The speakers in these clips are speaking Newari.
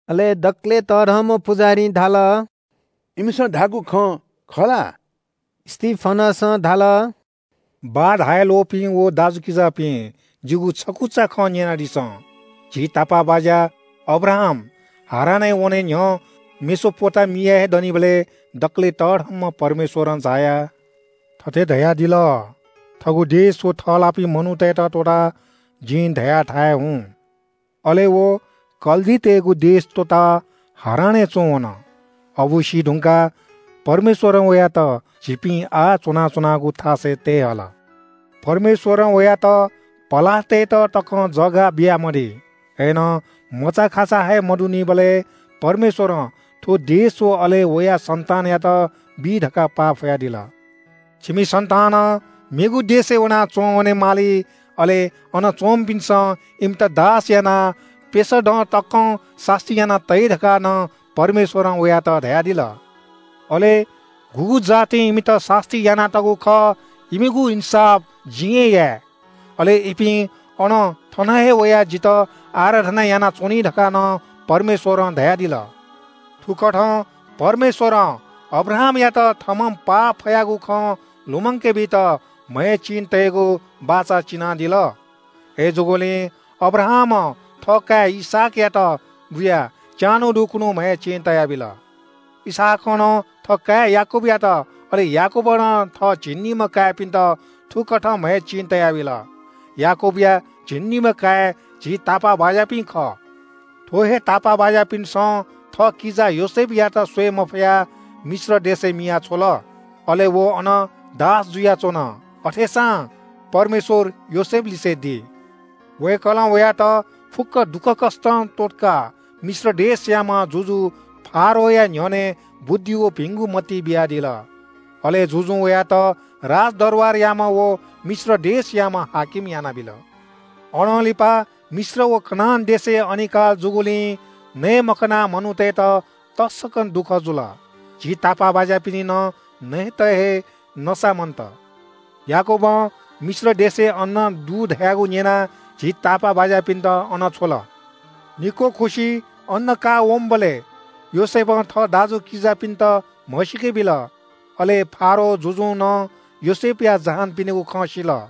अले दकलय् तःधंम्‍ह पुजाहारीं धाल – “इमिसं धाःगु खँ खः ला?” स्‍तिफनसं धाल – “बाः धाये ल्‍वःपिं व दाजुकिजापिं, जिगु छकुचा खँ न्‍यनादिसँ। झी तापाःबाज्‍या अब्राहाम हारानय् वने न्‍ह्यः मेसोपोटामियाय् दनिबलय् दकलय् तःधंम्‍ह परमेश्‍वरं झायाः थथे धयादिल – ‘थःगु देश व थःलाःपिं मनूतय्‌त त्‍वःताः जिं धयाथाय् हुँ।’ अले व कल्‍दीतय्‌गु देश त्‍वःताः हारानय् च्‍वंवन। अबु सीधुंकाः परमेश्‍वरं वयात झीपिं आः च्‍वनाच्‍वनागु थासय् तये हल। “परमेश्‍वरं वयात पलाः तयेत तकं थाय्‌ बियामदी। अय्‌नं मचाखाचा हे मदुनिबलय् परमेश्‍वरं थ्‍व देश व अले वया सन्‍तानयात बी धकाः पाफयादिल। छिमि सन्‍तानं मेगु देशय् वनाः च्‍वंवने माली, अले अन च्‍वंपिन्‍सं इमित दास यानाः प्‍यसः दँ तकं सास्‍ती याना तइ धकाः नं परमेश्‍वरं वयात धयादिल। अले गुगु जातिं इमित सास्‍ती यानातःगु खः इमिगु इन्‍साफ जिं हे याये। ‘अले इपिं अनं थन हे वयाः जितः आराधना यानाच्‍वनी’ धकाः नं परमेश्‍वरं धयादिल। “थुकथं परमेश्‍वरं अब्राहामयात थःम्‍हं पाफयागु खँ लुमंके बीत म्‍हय् चिं तयेगु बाचा चिनादिल। अय्‌जूगुलिं अब्राहामं थःकाय् इसहाकयात बुयाः च्‍यान्‍हु दुखुन्‍हु म्‍हय् चिं तयाबिल। इसहाकं नं थःकाय् याकूबयात, अले याकूबं नं थः झिंनिम्‍ह काय्‌पिन्‍त थुकथं म्‍हय् चिं तयाबिल। याकूबया झिंनिम्‍ह काय् झी तापाःबाज्‍यापिं खः।” “थ्‍व हे तापाःबाज्‍यापिन्‍सं थःकिजा योसेफयात स्‍वये मफयाः मिश्र देशय् मिया छ्वल। अले व अन दास जुयाच्‍वन। अथेसां परमेश्‍वर योसेफलिसे दी। वय्‌कलं वयात फुक्‍क दुःखकष्‍टं त्‍वःतकाः मिश्र देशयाम्‍ह जुजु फारोहया न्‍ह्यःने बुद्धि व भिंगु मति बियादिल। अले जुजुं वयात राजदरबारयाम्‍ह व मिश्र देशयाम्‍ह हाकिम यानाबिल। “अनं लिपा मिश्र व कनान देशय् अनिकाल जूगुलिं नये मखनाः मनूतय्‌त तसकं दुःख जुल। झी तापाःबाज्‍यापिनि नं नयेत हे नसा मन्‍त। याकूबं मिश्र देशय् अन्‍न दु धयागु न्‍यनाः झी तापाःबाज्‍यापिन्‍त अन छ्वल। निक्‍वः खुसि अन्‍न काःवंबलय् योसेफं थः दाजुकिजापिन्‍त म्‍हसीके बिल। अले फारो जुजुं नं योसेफया जहानपिनिगु खँ सिल।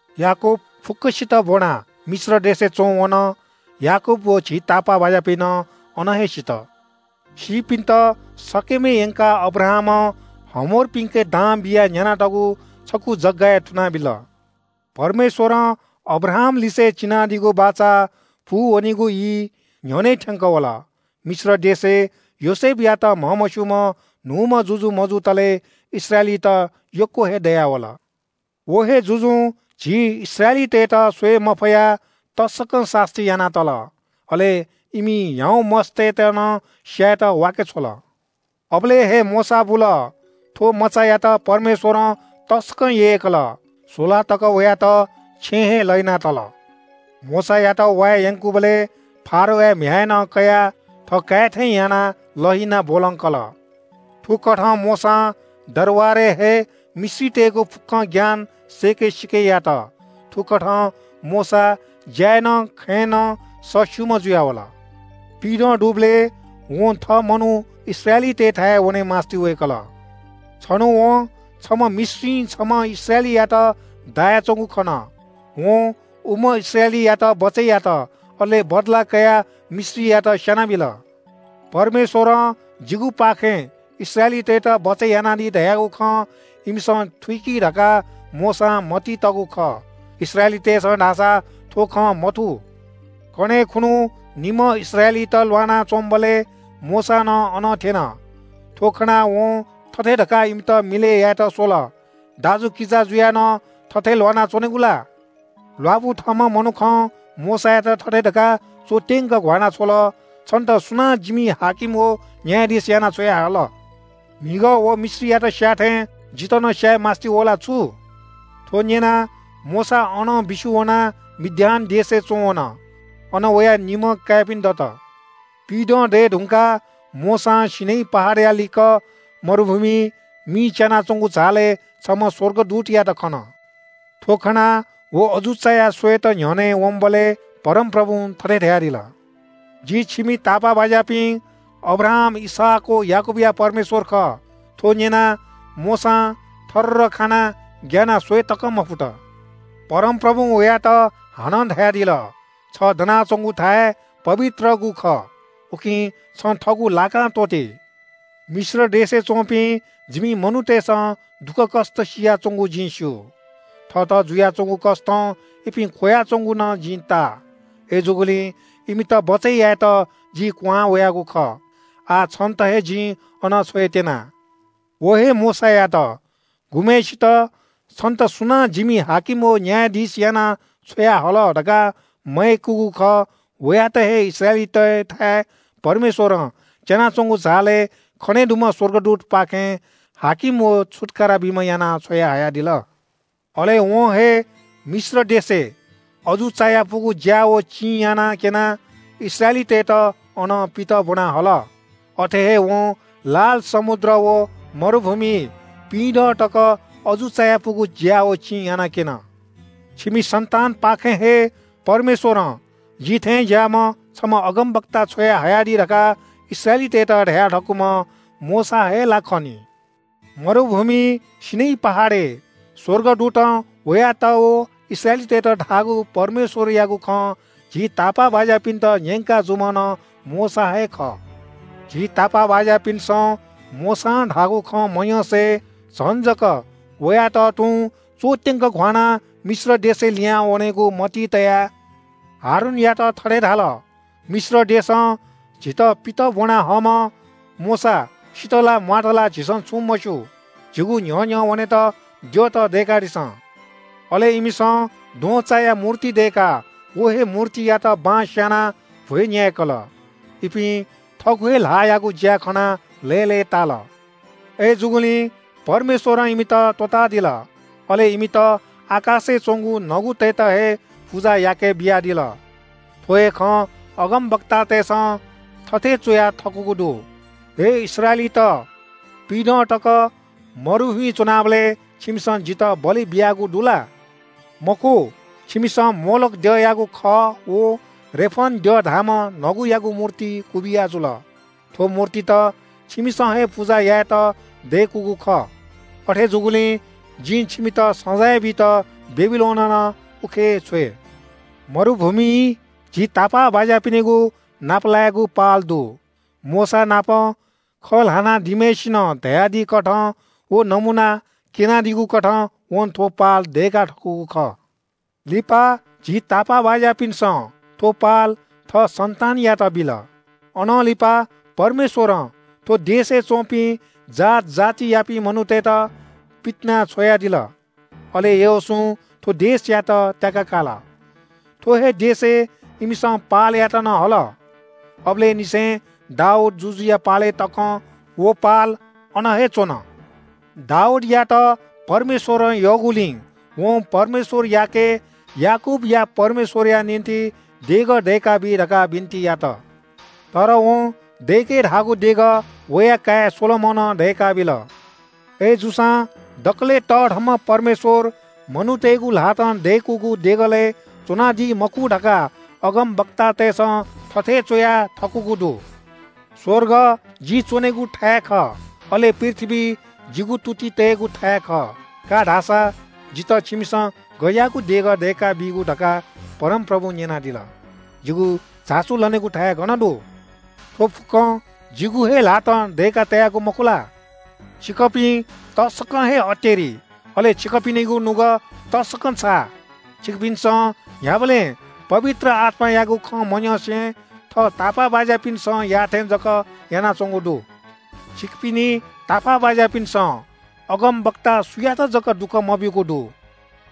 याकूब फुक्‍कसित ब्‍वनाः मिश्र देशय् च्‍वंवन। याकूब व झी तापाःबाज्‍यापिं नं अन हे सित। सीपिन्‍त शकेमय् यंकाः अब्राहामं हमोरपिन्‍के दां बियाः न्‍यानातःगु छकू जगय् थुनाबिल।” “परमेश्‍वरं अब्राहामलिसे चिनादीगु बाचा पूवनीगु ई न्‍ह्यःने थ्‍यंकः वल। मिश्र देशय् योसेफयात म्‍हमस्‍यूम्‍ह न्‍हूम्‍ह जुजु मजुतले इस्राएलीत यक्‍व हे दयावल। व हे जुजुं झी इस्राएलीतय्‌त स्‍वये मफयाः तसकं सास्‍ती याना तल। अले इमि ह्याउँ मस्‍तय्‌त नं स्‍यायेत वांछ्वय्‌के बीगु। “अबलय् हे मोशा बुल। थ्‍व मचायात परमेश्‍वरं तसकं यय्‌कल। स्‍वला तक वयात छेँय् हे लहिना तल। मोशायात वाये यंकूबलय् फारोया म्‍ह्याय्‌नं कयाः थःकाय् थें यानाः लहिनाः ब्‍वलंकल। थुकथं मोशां दरबारय् हे मिश्रतय्‌गु फुक्‍कं ज्ञान सय्‌के सीके यात। थुकथं मोशा ज्‍याय् नं खँय् नं सःस्‍यूम्‍ह जुयावल।” “पिइदँ दुबलय् वं थः मनू इस्राएली दाजुकिजातय्‌थाय् वने मास्‍ति वय्‌कल। छन्‍हु वं छम्‍ह मिश्रीं छम्‍ह इस्राएलीयात दायाच्‍वंगु खन। वं उम्‍ह इस्राएलीयात बचय् यात अले बदला कयाः मिश्रीयात स्‍यानाबिल। परमेश्‍वरं जिगुपाखें इस्राएलीतय्‌त बचय् यानादी धयागु खँ इमिसं थुइकी धकाः मोशां मतिइ तःगु खः। इस्राएलीतय्‌सं धाःसा थ्‍व खँ मथू। “कन्‍हय् खुन्‍हु निम्‍ह इस्राएलीत ल्‍वाना च्‍वंबलय् मोशा नं अन थ्‍यन। थ्‍व खनाः वं थथे धकाः इमित मिलय् यायेत स्‍वल – ‘दाजुकिजा जुयाः नं थथे ल्‍वाना च्‍वनेगु ला?’ “ल्‍वापु थःम्‍ह मनुखं मोशायात थथे धकाः च्‍वत्‍यंक घ्‍वाना छ्वल – ‘छन्‍त सुनां जिमि हाकिम व न्‍यायाधीश यानाः छ्वयाहल? म्‍हिगः व मिश्रीयात स्‍याः थें जितः नं स्‍याये मास्‍ति वः ला छु?’ थ्‍व न्‍यनाः मोशा अनं बिस्‍युं वनाः मिद्यान देशय् च्‍वंवन। अन वया निम्‍ह काय्‌पिं दत।” “पिइदँ दये धुंकाः मोशां सीनै पहाडया लिक्‍क मरुभूमिइ मि च्‍यानाच्‍वंगु झालय् छम्‍ह स्‍वर्गदूतयात खन। थ्‍व खनाः व अजू चायाः स्‍वयेत न्‍ह्यःने वंबलय् परमप्रभुं थथे धयादिल – ‘जि छिमि तापाःबाज्‍यापिं अब्राहाम, इसहाक व याकूबया परमेश्‍वर खः।’ थ्‍व न्‍यनाः मोशां थररर खानाः ग्‍यानाः स्‍वये तकं मफुत। “परमप्रभुं वयात हानं धयादिल – ‘छ दनाच्‍वंगु थाय् पवित्रगु खः। उकिं छं थःगु लाकां त्‍वःति। मिश्र देशय् च्‍वंपिं जिमि मनूतय्‌सं दुःखकष्‍ट सियाच्‍वंगु जिं स्‍यू। थःत जुयाच्‍वंगु कष्‍टं इपिं ख्‍वयाच्‍वंगु नं जिं ताः। अय्‌जूगुलिं इमित बचय् यायेत जि क्‍वहां वयागु खः। आः छन्‍त हे जिं अन छ्वयेत्‍यना।’ “व हे मोशायात, गुम्‍हय्‌सित ‘छन्‍त सुनां जिमि हाकिम व न्‍यायाधीश यानाः छ्वयाहल?’ धकाः मयय्‌कूगु खः, वयात हे इस्राएलीतय्‌थाय् परमेश्‍वरं च्‍यानाच्‍वंगु झालय् खने दुम्‍ह स्‍वर्गदूतपाखें हाकिम व छुत्‍कारा बीम्‍ह याना छ्वयाहयादिल। अले वं हे मिश्र देशय् अजू चायापुगु ज्‍या व चिं यानाक्‍यनाः इस्राएलीतय्‌त अनं पित ब्‍वना हल। अथे हे वं लाल समुद्र व मरुभूमिइ पिइदँ तक अजू चायापुगु ज्‍या व चिं यानाक्‍यन। “‘छिमि इस्राएली दाजुकिजापाखें हे परमेश्‍वरं जि थें ज्‍याःम्‍ह छम्‍ह अगमवक्ता छ्वयाहयादी’ धकाः इस्राएलीतय्‌त धया थकूम्‍ह मोशा हे ला खः नि। मरुभूमिइ सीनै पहाडय् स्‍वर्गदूतं वयात व इस्राएलीतय्‌त धाःगु परमेश्‍वरयागु खँ झी तापाःबाज्‍यापिन्‍त न्‍यंका जूम्‍ह नं मोशा हे खः। “झी तापाःबाज्‍यापिन्‍सं मोशां धाःगु खँ मन्‍यंसे झन जक वयात तुं च्‍वत्‍यंक घ्‍वानाः मिश्र देशय् लिहां वनेगु मतिइ तयाः हारूनयात थथे धाल – ‘मिश्र देशं झीत पित ब्‍वना हःम्‍ह मोशा सित ला म्‍वात ला झीसं छुं मस्‍यू। झीगु न्‍ह्यः न्‍ह्यः वनेत द्यःत दय्‌कादिसँ।’ अले इमिसं द्वहंचाया मूर्ति दय्‌काः व हे मूर्तियात बलि बियाः भ्‍वय् न्‍याय्‌कल। इपिं थःगु हे ल्‍हाःयागु ज्‍या खनाः लय्‌लय्‌ताल। अय्‌जूगुलिं परमेश्‍वरं इमित त्‍वःतादिल, अले इमित आकाशय् च्‍वंगु नगुतय्‌त हे पुजा याकेबियादिल। थ्‍व हे खँ अगमवक्तातय्‌सं थथे च्‍वया थकूगु दु – “‘हे इस्राएलीत, पिइदँ तक मरुभूमिइ च्‍वनाबलय् छिमिसं जितः बलि बियागु दु ला? मखु, छिमिसं मोलोख द्यःयागु खः व रेफन द्यः धाःम्‍ह नगुयागु मूर्ति क्‍वबिया जुल। थ्‍व मूर्तित छिमिसं हे पुजा यायेत दय्‌कूगु खः। अथे जूगुलिं जिं छिमित सजाँय बीत बेबिलोनं नं उखे छ्वये।’” “मरुभूमिइ झी तापाःबाज्‍यापिनिगु नापलाय्‌गु पाल दु। मोशानापं खँ ल्‍हाना दीम्‍हय्‌सिनं धयादीकथं व नमूना क्‍यनादीगुकथं वं थ्‍व पाल दय्‌का थकूगु खः। लिपा झी तापाःबाज्‍यापिन्‍सं थ्‍व पाल थः सन्‍तानयात बिल। अनं लिपा परमेश्‍वरं थ्‍व देशय् च्‍वंपिं जात जातियापिं मनूतय्‌त पितिनाछ्वयादिल। अले यहोशूं थ्‍व देशयात त्‍याका काल। थ्‍व हे देशय् इमिसं पालयात नं हल। अबलय् निसें दाऊद जुजुया पालय् तकं व पाल अन हे च्‍वन। “दाऊदयात परमेश्‍वरं यःगुलिं वं परमेश्‍वरयाके याकूबया परमेश्‍वरया निंतिं देगः दय्‌काबी धकाः बिन्‍ति यात। तर वं दय्‌के धाःगु देगः वया काय् सोलोमनं दय्‌काबिल। अय्‌जूसां दकलय् तःधंम्‍ह परमेश्‍वर मनूतय्‌गु ल्‍हातं दय्‌कूगु देगलय् च्‍वनादी मखु धकाः अगमवक्तातय्‌सं थथे च्‍वया थकूगु दु – “‘स्‍वर्ग जि च्‍वनेगु थाय् खः, अले पृथ्‍वी जिगु तुति तयेगु थाय् खः। का धा सा, जितः छिमिसं गज्‍याःगु देगः दय्‌का बीगु’ धकाः परमप्रभुं न्‍यनादिल। ‘जिगु झासु लनेगु थाय् गन दु? थ्‍व फुक्‍कं जिगु हे ल्‍हातं दय्‌का तयागु मखु ला?’” “छिकपिं तसकं हे अतेरि, अले छिकपिनिगु नुगः तसकं छाः। छिकपिन्‍सं न्‍ह्याबलें पवित्र आत्‍मायागु खँ मन्‍यंसे थः तापाःबाज्‍यापिन्‍सं याःथें जक यानाच्‍वंगु दु। छिकपिनि तापाःबाज्‍यापिन्‍सं अगमवक्ता सुयात जक दुःख मब्‍यूगु दु?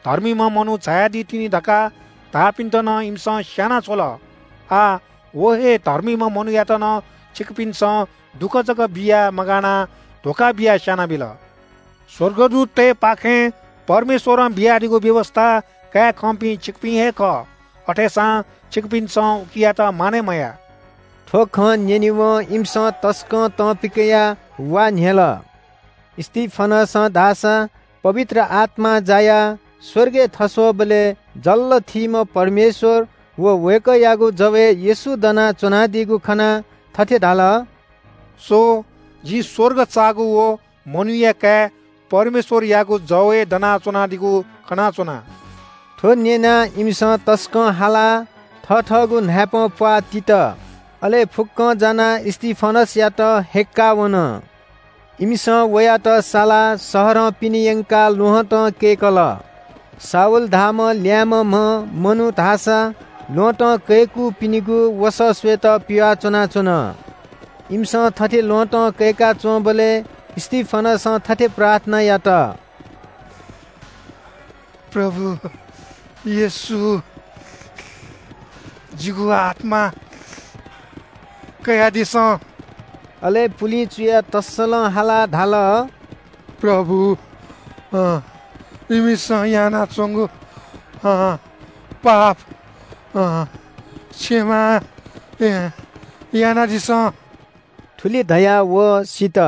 धर्मीम्‍ह मनू झायादी तिनि धकाः धाःपिन्‍त नं इमिसं स्‍याना छ्वल। आः व हे धर्मीम्‍ह मनूयात नं छिकपिन्‍सं दुःख जक बियाः मगानाः धोखा बियाः स्‍यानाबिल। स्‍वर्गदूततय्‌पाखें परमेश्‍वरं बियादीगु व्‍यवस्‍था काये खंपिं छिकपिं हे खः, अथेसां छिकपिन्‍सं उकियात मानय् मयाः।” थ्‍व खँ न्‍यनेवं इमिसं तसकं तं पिकयाः वा न्‍ह्यल। स्‍तिफनसं धाःसा पवित्र आत्‍मां जायाः स्‍वर्गय् थस्‍वःबलय् जल्‍ल थीम्‍ह परमेश्‍वर व वय्‌कःयागु जवय् येशू दनाच्‍वनादीगु खनाः थथे धाल – “स्‍व, जिं स्‍वर्ग चाःगु व मनूया काय् परमेश्‍वरयागु जवय् दनाच्‍वनादीगु खनाच्‍वना।” थ्‍व न्‍यनाः इमिसं तसकं हालाः थथःगु न्‍हाय्‌पंप्‍वाः तित। अले फुक्‍कं जानाः स्‍तिफनसयात हय्‌क्‍काः वन। इमिसं वयात सालाः शहरं पिने यंकाः ल्‍वहँतं कय्‌कल। शाऊल धाःम्‍ह ल्‍याय्‌म्‍हम्‍ह मनू धाःसा ल्‍वहँतं कय्‌कूपिनिगु वसः स्‍वयेत पिवाः च्‍वनाच्‍वन। इमिसं थथे ल्‍वहँतं कय्‌का च्‍वंबलय् स्‍तिफनसं थथे प्रार्थना यात – “प्रभु येशू, जिगु आत्‍मा कयादिसँ।” अले पुलिं चुयाः तःसलं हालाः धाल – “प्रभु, इमिसं यानाच्‍वंगु पाप क्षमा यानादिसँ।” थुलि धयाः व सित।